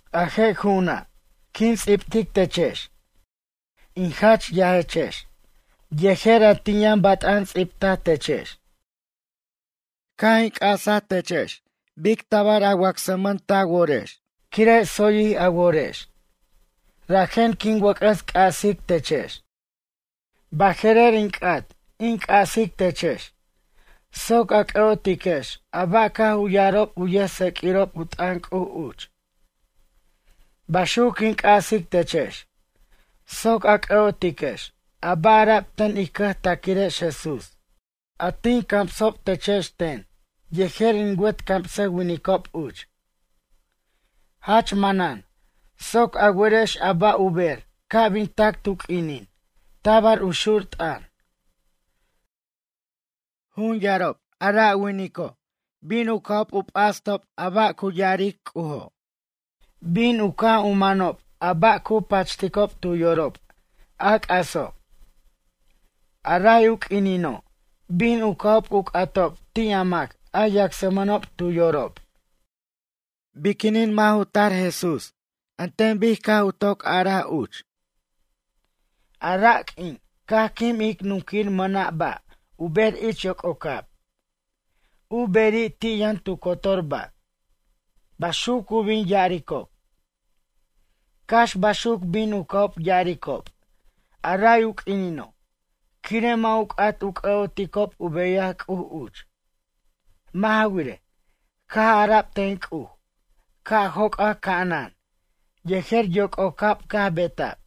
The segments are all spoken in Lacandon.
A je' ju'una', quin ts'ibtic techex, in jach yajechex, yejer a tin yʌn bat'an ts'ibtaj techex. Caj in c'asa techex bic tabar a wacsman ta worex quire' tsoyjij a worex, rajen quin wʌc'ʌs c'asic techex. Baje'rer in c'at in c'asic techex, soc a c'ʌ'otiquex a ba' caj u ya'arob u yʌjtseq'uirob u t'ʌn C'uj uch. Baxuc quin c'asic techex soc a c'ʌ'otiquex a ba' ara'b ten ij cʌjtaquirex Jesús, a tin camsob techex ten yejer in wet camsʌwinicob uch. Jach manan soc a werex a ba' u ber ca' bin tac tu q'uinin tabar u xur t'ʌn. Jun yarob a ra' winico' bin u ca'ob u p'astob a ba' cu ya'aric C'ujo' bin u caj u manob a ba' cu pachticob tu yorob, a c'aso'. A ray u q'uinino' bin u ca'ob u c'atob ti' a mac a yacsmʌnob tu yorob: “Biquinin mʌ' ju tar Jesús an ten bic caj u toc ya'araj uch? A ra' q'uin caj quim ic nunquir mʌna' ba' u ber ich yoc'ocab, u beri' ti' yʌn tu cotor ba'.” Baxuc cu bin ya'aricob. Cax baxuc bin u ca'ob ya'aricob a ray u q'uinino', quire' mʌ' u c'at u c'ʌ'oticob u beyaj C'uj uch. Mʌ' ja wirej, caj ara'b ten C'uj ca' joc'ac ca'anan yejer yoc'ocab caj beta'b.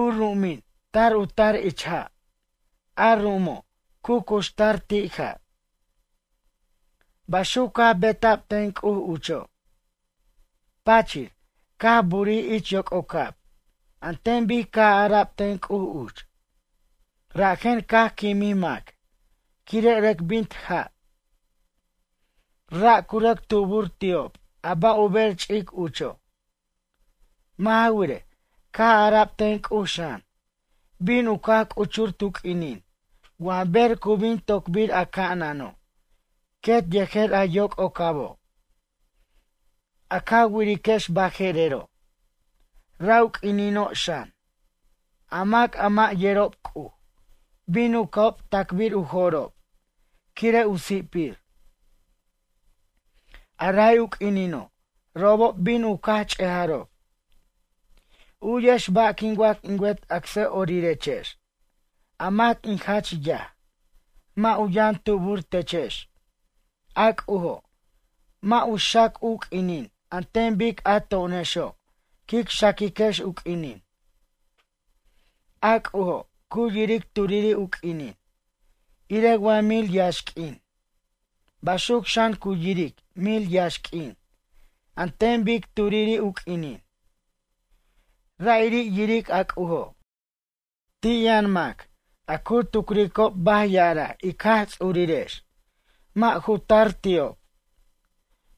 U ru'umin tar u tar ich ja', a ru'umo', cu cuxtar ti' ja'. Baxuc caj beta'b ten C'uj ucho'. Pachir, caj burij ich yoc'ocab an ten bic caj ara'b ten C'uj uch, rajen caj quimij mac quire' rʌc bint ja'. Ra' cu rʌc tubur ti'ob a ba' u ber ch'ic ucho'. Mʌ' ja wirej, caj ara'b ten C'uj xan, bin u caj c'uchur tu q'uinin wa ber cu bin tocbir a ca'anano' quet yejer a yoc'ocabo', a ca wiriquex baje'rero'. Ra' u q'uinino' xan, a mac a mʌ' yerob C'uj, bin u ca'ob tacbir u jo'rob quire' u si'pir. A ray u q'uinino' robob bin u caj ch'ejarob. U'yex ba' quin wac in wet acsʌ'orirechex, a mac in jach yaj. Mʌ' u yʌn tubur techex, a C'ujo', mʌ' u xac u q'uinin an ten bic a to'onexo' quic xaquiquex u q'uinin. A C'ujo' cu yiric turiri' u q'uinin irej wa mil yaxq'uin. Baxuc xan cu yiric mil yaxq'uin an ten bic turiri' u q'uinin. Ra'iri' yiric a C'ujo'. Ti' yʌn mac a cu tucricob baj ya'araj ic Jaj Ts'urirex mʌ' ju tar ti'ob.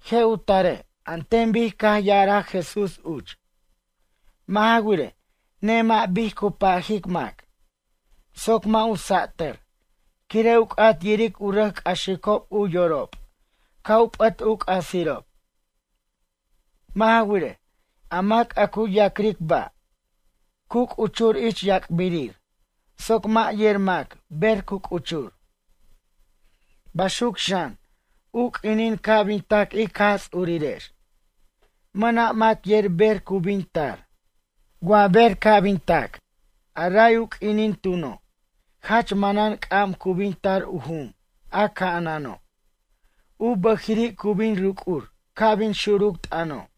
Je' u tare' an ten bic caj ya'araj Jesús uch. Mʌ' ja wirej, nemʌ' bic cu pajic mac, soc mʌ' u satʌr quire' u c'at yiric u rʌc c'axicob u yorob ca' u p'ʌt u c'asirob. Mʌ' ja wirej, a mac a cu ya'cric ba', cu c'uchur ich yac'birir soc mʌ' yer mac ber cu c'uchur. Baxuc xan, u q'uinin ca' bin tac ic Jaj Ts'urirex. Mʌna' mac yer ber cu bin tar. Wa ber ca' bin tac, a ray u q'uinin tuno' jach manan c'am cu bin tar u jum a ca'anano', u bʌjiri' cu bin ruc'ur ca' bin xuruc t'ʌno'.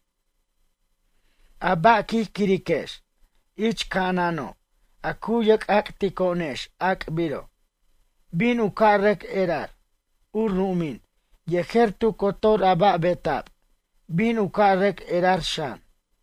A ba' quij quiriquex ich ca'anano' a cu yerc'ac'tico'onex ac'biro', bin u ca' rʌc erar. U ru'umin yejer tu cotor a ba' beta'b bin u ca' rʌc erar xan.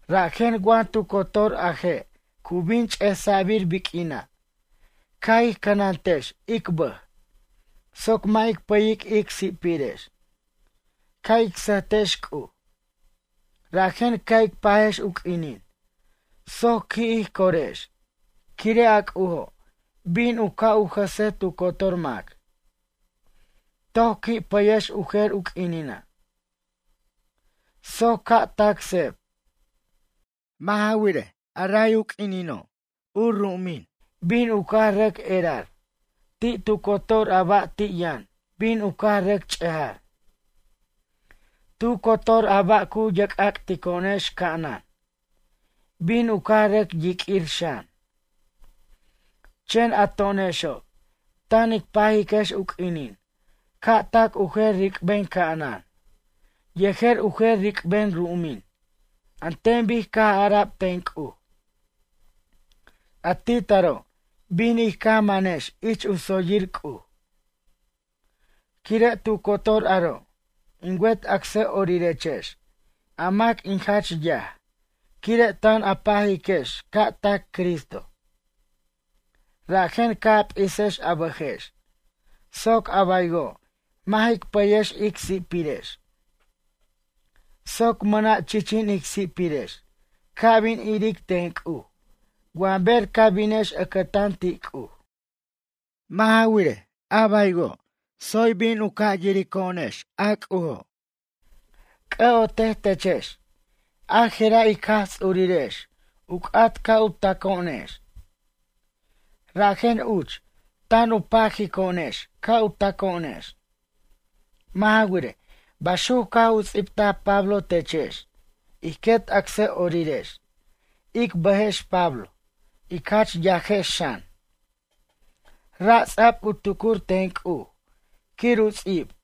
Rajen wa tu cotor a je' cu bin ch'esa'bir biq'uina' ca' ij cʌnantex ic bʌj soc mʌ' ic pʌyic ic si'pirex. Ca' ic sʌjtex C'uj. Rajen ca' ic pajex u q'uinin soc qui' ij corex quire' a C'ujo' bin u ca' u jʌse tu cotor mac. Toc qui' pʌyex u jer u q'uinina', soc ca' tac seb. Mʌ' ja wirej, a ray q'uinino' u ru'umin bin u caj rʌc erar, ti cotor a ba' ti' yʌn bin u caj rʌc ch'ejar. Tu cotor a ba' cu yerc'ac'tico'onex ca'anan, bin u caj rʌc yiq'uir xan. Chen a to'onexo' tan ic pajiquex u q'uinin ca' tac u jer ric'ben ca'anan yejer u jer ric'ben ru'umin an ten bic caj ara'b ten C'uj. A ti taro' bin ij caj manex ich u tsoyir C'uj. Quire' tu cotor aro' in wet acsʌ'orirechex a mac in jach yaj quire' tan a pajiquex ca' tac Cristo. Rajen ca' a p'isex a bʌjex soc a baywo' mʌ' jic pʌyex ic si'pirex. Soc mʌna' chichin ic si'pirex ca' bin iric ten C'uj wa ber ca binex ʌcʌtan ti' C'uj. Mʌ' ja wirej, a baywo' tsoy bin u ca' yirico'onex a C'ujo'. C'ʌ'otej techex, ajera' ic Jaj Ts'urirex u c'at ca' u taco'onex. Rajen uch tan u pajico'onex ca' taco'onex. Mʌ' ja wirej, baxuc caj u ts'ibtaj Pablo techex ij quet acsʌ'orirex, ic bʌjex Pablo, ic jach yajex xan. Ra' ts'a'b u tucur ten C'uj quir u ts'ib.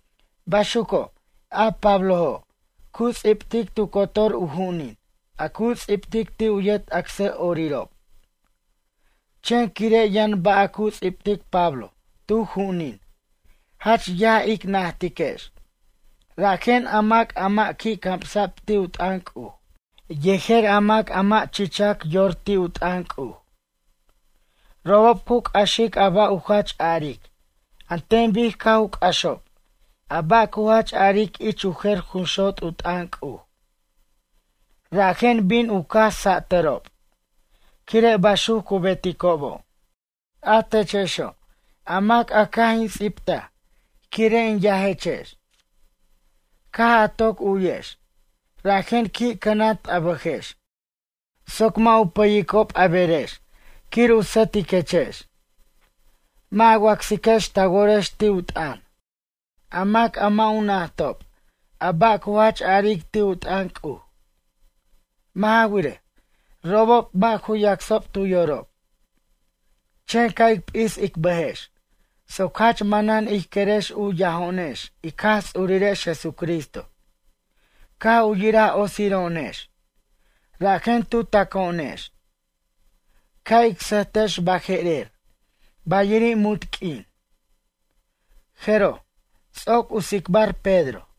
Baxuco', a Pablojo', cu ts'ibtic tu cotor u ju'unin a cu ts'ibtic ti' u yet acsʌ'orirob. Chen quire' yʌn ba' a cu ts'ibtic Pablo tu ju'unin jach yaj ic najtiquex rajen a mac a mʌ' qui' camsa'b ti' u t'ʌn C'uj, yejer a mac a mʌ' chichac yor ti' u t'ʌn C'uj. Robob cu c'axic a ba' u jach a'aric an ten bic caj u c'axob a ba' cu jach a'aric ich u jer jun xot' u t'ʌn C'uj. Rajen bin u caj satʌrob quire' baxuc cu beticobo'. A techexo', a mac a caj in ts'ibtaj quire' in yajechex. Caj a toc u'yex, rajen qui' cʌnant a bʌjex soc mʌ' u pʌyicob a berex quir u sʌtiquechex. Mʌ' a wacsiquex ta worex ti' u t'ʌn, a mac a mʌ' u najtob a ba' cu jach a'aric ti' u t'ʌn C'uj. Mʌ' ja wirej, robob mʌ' ju yacsob tu yorob. Chen ca' ic p'is ic bʌjex soc jach manan ij querex u yajo'onex ic Jaj Ts'urirex Jesucristo, caj u yiraj otsiro'onex, rajen tu taco'onex. Ca' ic sʌjtex baje'rer bayiri' munt q'uin. Jeroj, ts'oc u tsicbar Pedro.